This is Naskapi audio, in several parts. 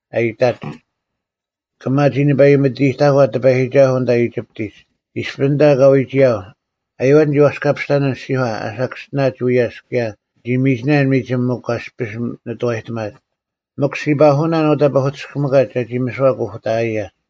ᐊ ᐃᑕᒡ, “ᑭᒪ ᒋ ᓂᐸᐃᒥᑎᑕᒂ ᑎᐸᔨᒋᒐᓱᐤ ᐊᓐᑕ ᐃᒋᑉᑎᒡ! ᐃᔅᐱ ᐊᓐᑕ ᑲ ᐎᒋᔭᒡ, ᐊᔪᐛᒡ ᓂᒋ ᐛᔅᑲᐱᔅᑕᓇᓐ ᐊᔅᒋᒂ ᐊ ᓴᑭᔅᒋᓇᒡ ᐎᔭᔅ ᑭᔭ ᓂᒋ ᒥᒋᓇᓐ ᒥᒋᒻ ᒥᒄ ᐊᔅᐱᔅ ᓂᑐᐛᔨᑎᒪᒡ, ᒥᒄ ᔅᒋ ᐸᓱᐅᓇᓐ ᐅᑕ ᐸᐧᑯᑎᔅᑭᒥᑲᒡ ᒐᒋ ᒥᓯᐛ ᑯᐧᑭᑕᐊᔭᒡ᙮”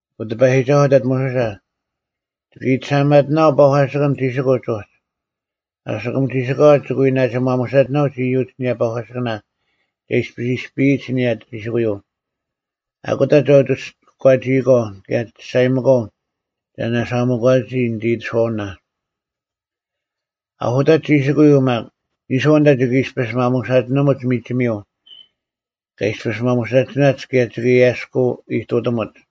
ᐊᑯ ᑎᐸᔨᒋᒐᓱᐤ ᐊᑕᑦ ᒧᓱᓴ, “ᒋᑭ ᐃᑎᓴᐊᒪᑎᓇᐛᐤ ᐸᒂᓯᑭᓐ ᒋᓯᑯᒡ ᐅᒡ, ᐊᓯᑯᒻ ᒋᓯᑲᐛ ᒋᑭ ᐎ ᓇᒋ ᒪᒧᓴᒋᓇᐅᒡ ᐃᔪᒡ ᐊᓂᔭ ᐸᒂᓯᑭᓇ ᒐ ᐃᔅᐱ ᐃᔅᐱᔨᒡ ᐊᓂᔭ ᒋᓯᑯᔪᐤ᙮ ᐊᑯᑕ ᒐ ᐅᒋ ᑯᒂᒋᐃᒂᐤ ᑭᔭ ᒐᔅᒐᔨᒥᒂᐤ ᒐ ᓇᓴᐊᒥᒂᓂᒋ ᓂᑦ ᐃᑎᓱᐛᐅᓇ᙮ ᐊᓱᑕᒡ ᒋᓯᑯᔪᐤ ᒪᒃ, ᓂᔄᐤ ᐊᓐᑕ ᒋᑭ ᐃᔅᐱᔅ ᒪᒧᓴᒋᓂᒧᒡ ᒥᒋᒥᔪᐤ ᑲ ᐃᔅᐱᔅ ᒪᒧᓴᒋᓇᒡ ᑭᔭ ᒋᑭ ᐊᔭᔅᑯ ᐃᑐᑎᒧᒡ᙮”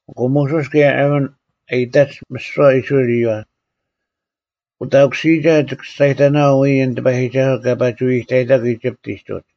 ᐊᑯ ᒧᓱᔅ ᑭᔭ ᐊᕋᓐ ᐊᔨᑕᒡ ᒥᓯᐛ ᐃᔅᕋᐃᓪ ᐃᔪᐛ, “ᐅᑕᑯᓯᔨᒐ ᒋᑭ ᒋᔅᒐᔨᑕᓇᐛᐤ ᐎᔾ ᐊᓐ ᑎᐸᔨᒋᒐᓱᐤ ᑲ ᐸᒋ ᐎᐎᑕᐃᑕᒄ ᐃᒋᑉᑎᒡ ᐅᒡ᙮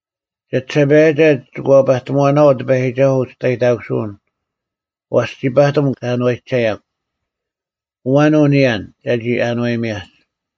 ᒐᒋᓴᐸᔭᒐ ᒋᑭ ᐛᐸᑎᒺᓇᐛᐤ ᑎᐸᔨᒋᒐᓱᐤ ᐅᒋᔅᑕᔨᑕᑯᓱᐅᓐ, ᐛᔅ ᒋ ᐸᑎᒻ ᑲ ᐊᓏᔨᒐᔭᒄ᙮ ᐊᐛᓐ ᐅ ᓂᔭᓐ, ᒐᒋ ᐊᓏᔨᒥᔭᒡ?”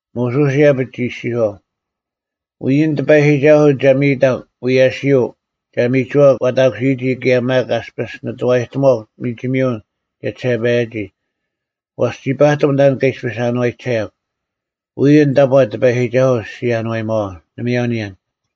ᒧᓱᔅ ᐃᔭᐱᒡ ᒋ ᐃᔅᒋᔄᐤ, “ᐎᔾ ᐊᓐ ᑎᐸᔨᒋᒐᓱᐤ ᒐ ᒥᔨᑕᒄ ᐎᔭᓯᔪᐤ ᒐ ᒥᒍᐛᒄ ᐛᑕᑯᓯᔨᒋ ᑭᔭ ᒪᒃ ᐊᔅᐱᔅ ᓂᑐᐛᔨᑎᒺᒄ ᒥᒋᒥᔪᐤ ᒋᔭᒋᓴᐸᔭᔨᒋ, ᐛᔅ ᒋ ᐸᑎᒻ ᑕᓐ ᑲ ᐃᔅᐱᔅ ᐊᓏᔨᒐᔭᒄ, ᐎᔾ ᐊᓐ ᑕᑈ ᑎᐸᔨᒋᒐᓱᐤ ᔅᒋ ᐊᓏᔨᒪᐛᐤ, ᓇᒪᔭᐤ ᓂᔭᓐ᙮”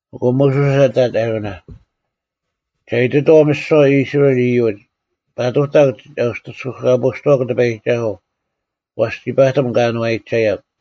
ᐊᑯ ᒧᓱᔅ ᐊᑕᑦ ᐊᕋᓇ, “ᒐ ᐃᑎᑥᐤ ᒥᓯᐛ ᐃᔅᕋᐃᓪ ᐃᔪᒡ, ‘ᐸᑐᑕᒄ ᒐ ᐅᑎᔅᑯᑲᐳᔅᑐᐛᒄ ᑎᐸᔨᒋᒐᓱᐤ, ᐛᔅ ᒋ ᐸᑎᒻ ᑲ ᐊᓏᔨᒐᔭᒄ᙮’”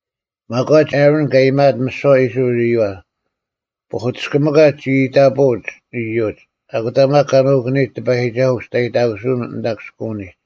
ᒪᒂᒡ ᐊᕋᓐ ᑲ ᐃᔨᒪᐊᑦ ᒥᓯᐛ ᐃᔅᕋᐃᓪ ᐃᔪᐛ, ᐸᐧᑯᑎᔅᑭᒥᑲᒡ ᒋ ᐃᑕᐳᐅᒡ ᐃᔪᒡ, ᐊᑯᑕ ᒪᒃ ᑲ ᓄᑯᓂᔨᒡ ᑎᐸᔨᒋᒐᓱᐤ ᐅᒋᔅᑕᔨᑕᑯᓱᐅᓐ ᐊᓐᑕ ᑭᔅᑯᐅᓂᒡ᙮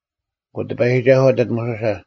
ᐊᑯ ᑎᐸᔨᒋᒐᓱᐤ ᐊᑕᑦ ᒧᓱᓴ,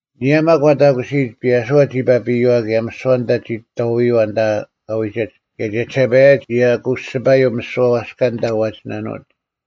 ᐊᓂᔭ ᒪᒃ ᐛᑕᑯᓯᔨᒡ, ᐱᔭᓱᐛ ᒋ ᐸᐱᔪᐛ ᑭᔭ ᒥᓯᐛ ᐊᓐᑕ ᒋ ᑥᐅᔪᐛ ᐊᓐᑕ ᑲ ᐎᒋᒡ, ᑭᔭ ᒋᔭᒋᓴᐸᔭᒡ ᒋ ᐊᑯᔅᒋᐸᔭᐤ ᒥᓯᐛ ᐛᔅᑲ ᐊᓐᑕ ᐛᒋᓇᓄᐅᒡ᙮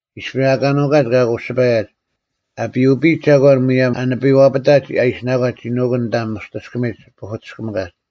ᐃᔅᐱ ᐊᑲ ᓄᒂᒡ ᑲ ᐊᑯᔅᒋᐸᔭᒡ, ᐊ ᐱᐅᐱᔨᒡ ᒐᒂᓐ ᒧᔭᒻ ᐊ ᓂᐱᐛᐱᑕᒡ ᐊ ᐃᓯᓇᒂᒡ ᒋ ᓄᑯᓐ ᐊᓐᑕ ᒧᔅᑎᔅᑭᒥᒡ ᐸᐧᑯᑎᔅᑭᒥᑲᒡ᙮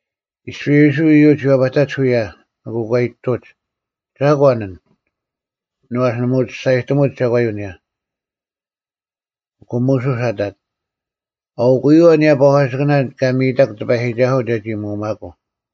ᐃᔅᐱ ᐃᔅᕋᐃᓪ ᐃᔪᒡ ᐎᔭᐸᑕᒡ ᐅᔭ, ᐊᑯ ᑲ ᐃᑎᑐᒡ, “ᒐᒂᓐ ᐊᓐ?” ᐛᔅ ᓇᒪ ᐅᒋ ᒋᔅᒐᔨᑎᒧᒡ ᒐᒂᔪᐤ ᐊᓂᔭ᙮ ᐊᑯ ᒧᓱᔅ ᐊᑕᑦ, “ᐊᐅᑯᔪᐛ ᐊᓂᔭ ᐸᒂᓯᑭᓇ ᑲ ᒥᔨᑕᒄ ᑎᐸᔨᒋᒐᓱᐤ ᒐᒋ ᒧᐅᒪᑯᐤ᙮”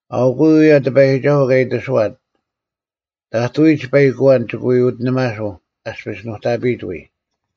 ᐊᐅᑯᔪᐤ ᐅᔭ ᑎᐸᔨᒋᒐᓱᐤ ᑲ ᐃᑎᓱᐛᑦ: ᑕᑐᐎᒡ ᐸᐃᒄ ᐊᐛᓐ ᒋᑭ ᐎ ᐅᑎᓂᒪᓱᐤ ᐊᔅᐱᔅ ᓄᑕᐱᔨᑦ ᐎᔾ᙮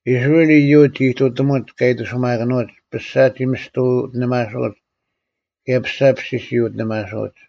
ᐃᔅᕋᐃᓪ ᐃᔪᒡ ᒋ ᐃᑐᑎᒧᒡ ᑲ ᐃᑎᓱᒪᑭᓄᐅᒡ᙮ ᐱᔅᒐ ᒋ ᒥᔅᑎ ᐅᑎᓇᓱᐅᒡ ᑭᔭ ᐱᔅᒐ ᐱᔅᓯᔅ ᒋ ᐅᑎᓇᓱᐅᒡ᙮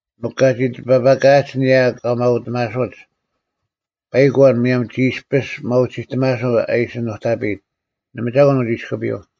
ᒥᒄ ᑲᒋ ᑎᐸᐸᑲᐊᒡ ᐊᓂᔭ ᑲ ᒪᐅᑎᒪᓱᒡ, ᐸᐃᒄ ᐊᐛᓐ ᒧᔭᒻ ᒋ ᐃᔅᐱᔅ ᒪᐅᒋᑎᒪᓱᐤ ᐊ ᐃᓯ ᓄᑕᐱᔨᑦ, ᓇᒪ ᒐᒂᓐ ᐅᒋ ᐃᔅᑯᐱᔪᐤ᙮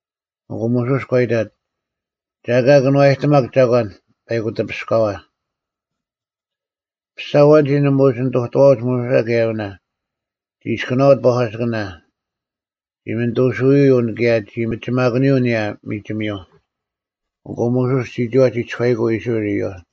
ᐊᑯ ᒧᓱᔅ ᒂ ᐃᑕᑦ, “ᒐ ᐊᑲ ᑭᓄᐛᔨᑎᒪᒃ ᒐᒂᓐ ᐸᐃᑯᑎᐱᔅᑲᐛ᙮” ᐱᔅᒐ ᐊᐛᓐᒋ ᓇᒪ ᐅᒋ ᓂᑐᑐᐛᐅᒡ ᒧᓱᓴ ᑭᔭ ᐊᕋᓇ, ᒋ ᐃᔅᑯᓇᐅᒡ ᐸᒂᓯᑭᓇ, ᒋ ᒥᓐᑐᓱᐅᔪᐤ ᑭᔭ ᒋ ᒥᒋᒪᑯᓂᔪᐤ ᐊᓂᔭ ᒥᒋᒥᔪᐤ᙮ ᐊᑯ ᒧᓱᔅ ᒋᒋᐛ ᒋ ᒋᔄᐃᑯᐤ ᐃᔅᕋᐃᓪ ᐃᔪᐛ᙮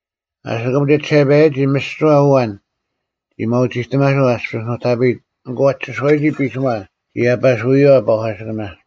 ᐊᓯᑯᒻ ᒋᔭᒋᓴᐸᔭᒋ ᒥᓯᐛ ᐊᐛᓐ ᒋ ᒪᐅᒋᑎᒪᓱᐤ ᐊ ᐃᔅᐱᔅ ᓄᑕᐱᔨᑦ ᐊᑯ ᐊ ᒋᓱᐎᔨᒋ ᐱᓯᒺ ᒋ ᐊᐸᓱᔪᐛ ᐸᒂᓯᑭᓇ᙮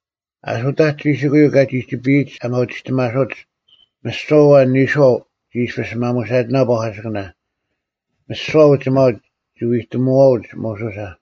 ᐊᓱᑕᒡ ᒋᓯᑯᔪᐤ ᑲᒋ ᒋᒋᐱᔨᒡ ᐊ ᒪᐅᒋᑎᒪᓱᒡ, ᒥᓯᐛ ᐊᐛᓐ ᓂᔄᐤ ᒋ ᐃᔅᐱᔅ ᒪᒧᓴᒋᓇᐤ ᐸᒂᓯᑭᓇ᙮ ᒥᓯᐛ ᐅᒋᒪᐅᒡ ᒋ ᐎᑎᒧᐛᐅᒡ ᒧᓱᓴ᙮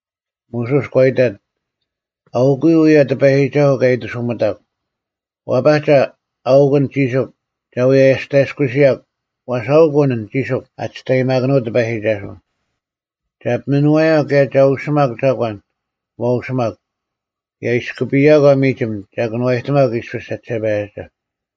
ᒧᓱᔅ ᒂ ᐃᑕᑦ “ᐊᐅᑯᔪᐤ ᐅᔭ ᑎᐸᔨᒋᒐᓱᐤ ᑲ ᐃᑎᓱᒥᑕᒄ: ᐛᐸᒐ, ᐊᐅᒄ ᐊᓐ ᒋᓱᒄ ᒐ ᐎ ᐊᔅᑕᔭᔅᑯᓯᔭᒄ ᐛᔅ ᐊᐅᒃ ᐊᓐ ᒋᓯᒄ ᐊ ᒋᔅᑕᔨᒪᑭᓄᐅᑦ ᑎᐸᔨᒋᒐᓱᐤ᙮ ᒐ ᐱᒥᓄᐛᔭᒄ ᑭᔭ ᒐ ᐅᓯᒪᒄ ᒐᒂᓐ ᐛ ᐅᓯᒪᒄ᙮ ᑭᔭ ᐃᔅᑯᐱᔭᒂ ᒥᒋᒻ ᒐ ᑭᓄᐛᔨᑎᒪᒄ ᐃᔅᐱᔅ ᒐᒋᓴᐸᔭᒐ᙮”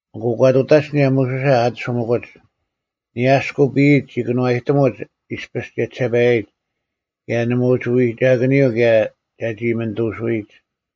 ᐊᑯ ᒂ ᑐᑕᒡ ᐊᓂᔭ ᒧᓱᓴ ᐊᑎᓱᒥᑯᒡ᙮ ᐊᓂᔭ ᐊᔅᑯᐱᔨᒡ, ᒋ ᑭᓄᐛᔨᑎᒧᒡ ᐃᔅᐱᔅ ᒋᔭᒋᓴᐸᔨᒡ ᑭᔭ ᓇᒪ ᒋ ᐅᒋ ᐎᒐᑭᓂᔪᐤ ᑭᔭ ᒐᒋ ᒥᓐᑐᓱᐎᒡ᙮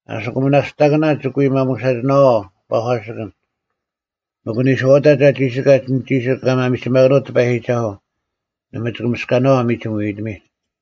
ᐊᓯᑯᒻ ᒥᓇᔅᑕᑭᓇ, ᒋᑭ ᐎ ᒪᒧᓴᒋᓇᐛᐤ ᐸᒂᓯᑭᓐ᙮ ᒥᒄ ᐊ ᓂᔄᐅᑕᒡ ᐊ ᒋᓯᑲᒡ ᐊᓐ ᒋᓯᒄ ᐊ ᒪᒥᒋᒪᑭᓄᐅᑦ ᑎᐸᔨᒋᒐᓱᐤ, ᓇᒪ ᒋᑭ ᒥᔅᑲᓇᐛᐤ ᒥᒋᒻ ᐎᐎᑎᒥᒡ᙮”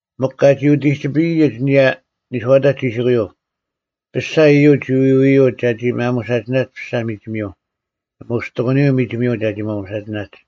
ᒥᒄ ᑲᒋ ᐅᑎᒋᐱᔨᒡ ᐊᓂᔭ ᓂᔄᐅᑕᒡ ᒋᓯᑯᔪᐤ, ᐱᔅᒐ ᐃᔪᒡ ᒋ ᐎᐎᔪᐅᒡ ᒐᒋ ᒪᒧᓴᒋᓇᒡ ᐱᔅᒐ ᒥᒋᒥᔪᐤ᙮ ᓇᒪ ᐅᒋ ᑎᑯᓂᔪᐤ ᒥᒋᒥᔪᐤ ᒐᒋ ᒪᒧᓴᒋᓇᒡ᙮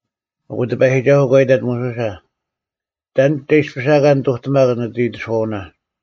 ᐊᑯ ᑎᐸᔨᒋᒐᓱᐤ ᒂ ᐃᑕᑦ ᒧᓱᓴ, “ᑕᓐ ᒐ ᐃᔅᐱᔅ ᐊᑲ ᓂᑐᑎᒪᒄ ᓂᑦ ᐃᑎᓱᐛᐅᓇ?”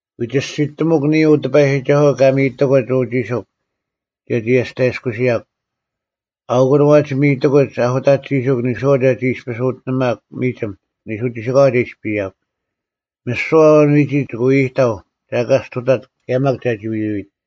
ᐎ ᒋᔅᒋᑎᒧᒃ ᓂᔾ ᐅ ᑎᐸᔨᒋᒐᓱᐤ ᑲ ᒥᔨᑎᑯᒡ ᐅ ᒋᓯᒄ ᒐᒋ ᐊᔅᑕᔭᔅᑯᓯᔭᒃ᙮ ᐊᐅᑯᓐ ᐛᒋ ᒥᔨᑎᑯᒡ ᐊᓱᑕᒡ ᒋᓯᒄ ᓂᔄᐤ ᒐᒋ ᐃᔅᐱᔅ ᐅᑎᓂᒪᒄ ᒥᒋᒻ ᓂᓱ ᒋᓯᑲᐛ ᒐ ᐃᔅᐱᔭᒄ᙮ ᒥᓯᐛ ᐊᐛᓐ ᐎᒋᒡ ᒋᑭ ᐎ ᐃᑕᐤ ᒐ ᐊᑲ ᔅᑐᑕᑦ ᑭᔭ ᒪᒃ ᒐᒋ ᐎᐎᑦ᙮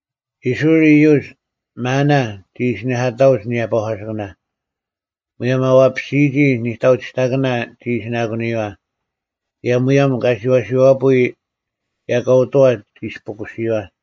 ᐃᔅᕋᐃᓪ ᐃᔪᒡ “ᒪᓇ” ᒋ ᐃᓯᓂᐧᑲᑕᐅᒡ ᐊᓂᔭ ᐸᒂᓯᑭᓇ᙮ ᒧᔭᒻ ᐊ ᐛᐸᓯᒋ ᓂᑕᐅᒋᑕᑭᓇ ᒋ ᐃᓯᓇᑯᓂᔪᐛ, ᑭᔭ ᒧᔭᒻ ᑲᓯᐛᓯᐛᐳᐎᔾ ᐃᔭᑲᐅᑐᐛ ᒋ ᐃᔅᐳᑯᓯᔪᐛ᙮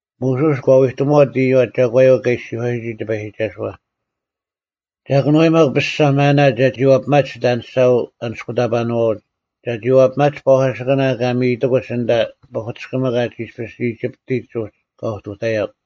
ᒧᓱᔅ ᒂ ᐎᑎᒧᐛᑦ ᐃᔪᐛ ᒐᒂᔪᐤ ᑲ ᐃᔅᒋᔄᔨᒋ ᑎᐸᔨᒋᒐᓱᐛ, “ᒐ ᑭᓄᐛᔨᒪᒄ ᐱᔅᒐ ᒪᓇ ᒐᒋ ᐛᐱᒪᒡ ᒋᑦ ᐊᓂᔅᒐ ᐊᓂᔅᑯᑕᐸᓄᐛᐅᒡ, ᒐᒋ ᐛᐱᒪᒡ ᐸᒂᓯᑭᓇ ᑲ ᒥᔨᑐᑯᒡ ᐊᓐᑕ ᐸᐧᑯᑎᔅᑭᒥᑲᒡ ᐃᔅᐱ ᐃᒋᑉᑎᒡ ᐅᒡ ᑲ ᐅᑐᑕᔭᒄ᙮”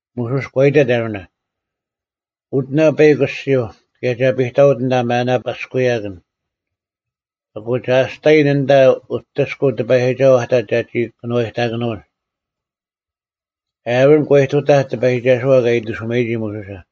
ᒧᓱᔅ ᒂ ᐃᑕᑦ ᐊᕋᓇ, “ᐅᑎᓇ ᐸᐃᒄ ᐊᔅᒋᐧᒄ ᑭᔭ ᒐ ᐱᑕᐅᑦ ᐊᓐᑕ ᒪᓇ ᐳᔅᑯᔭᑭᓐ᙮ ᐊᑯ ᒐ ᐊᔅᑕᔨᓐ ᐊᓐᑕ ᐅᑎᔅᑯᐤ ᑎᐸᔨᒋᒐᓱᐤ ᐊᑕᑦ ᒐᒋ ᑭᓄᐛᔨᑕᑭᓄᐅᒡ᙮” ᐊᕋᓐ ᒂ ᐃᑐᑕᐧᒄ ᑎᐸᔨᒋᒐᓱᐛ ᑲ ᐃᑎᓱᒪᔨᒋ ᒧᓱᓴ᙮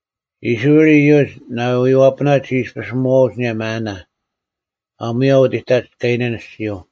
ᐃᔅᕋᐃᓪ ᐃᔪᒡ ᓇᐎᔪᐛᐱᐳᓇ ᒋ ᐃᔅᐱᔅ ᒧᐛᐅᒡ ᐊᓂᔭ ᒪᓇ, ᐊᒺᔭ ᐅᑎᑕᒡ ᑲᐃᓇᓐ ᐊᔅᒋᔪᐤ᙮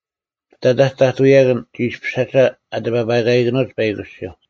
ᐱᑕᑕᒡ ᑕᑐᔭᑭᓐ ᒋ ᐃᔅᐱᓴᒐ ᐊ ᑎᐸᐸᑲᐃᑭᓄᐅᒡ ᐸᐃᒄ ᐊᔅᒋᐧᒄ᙮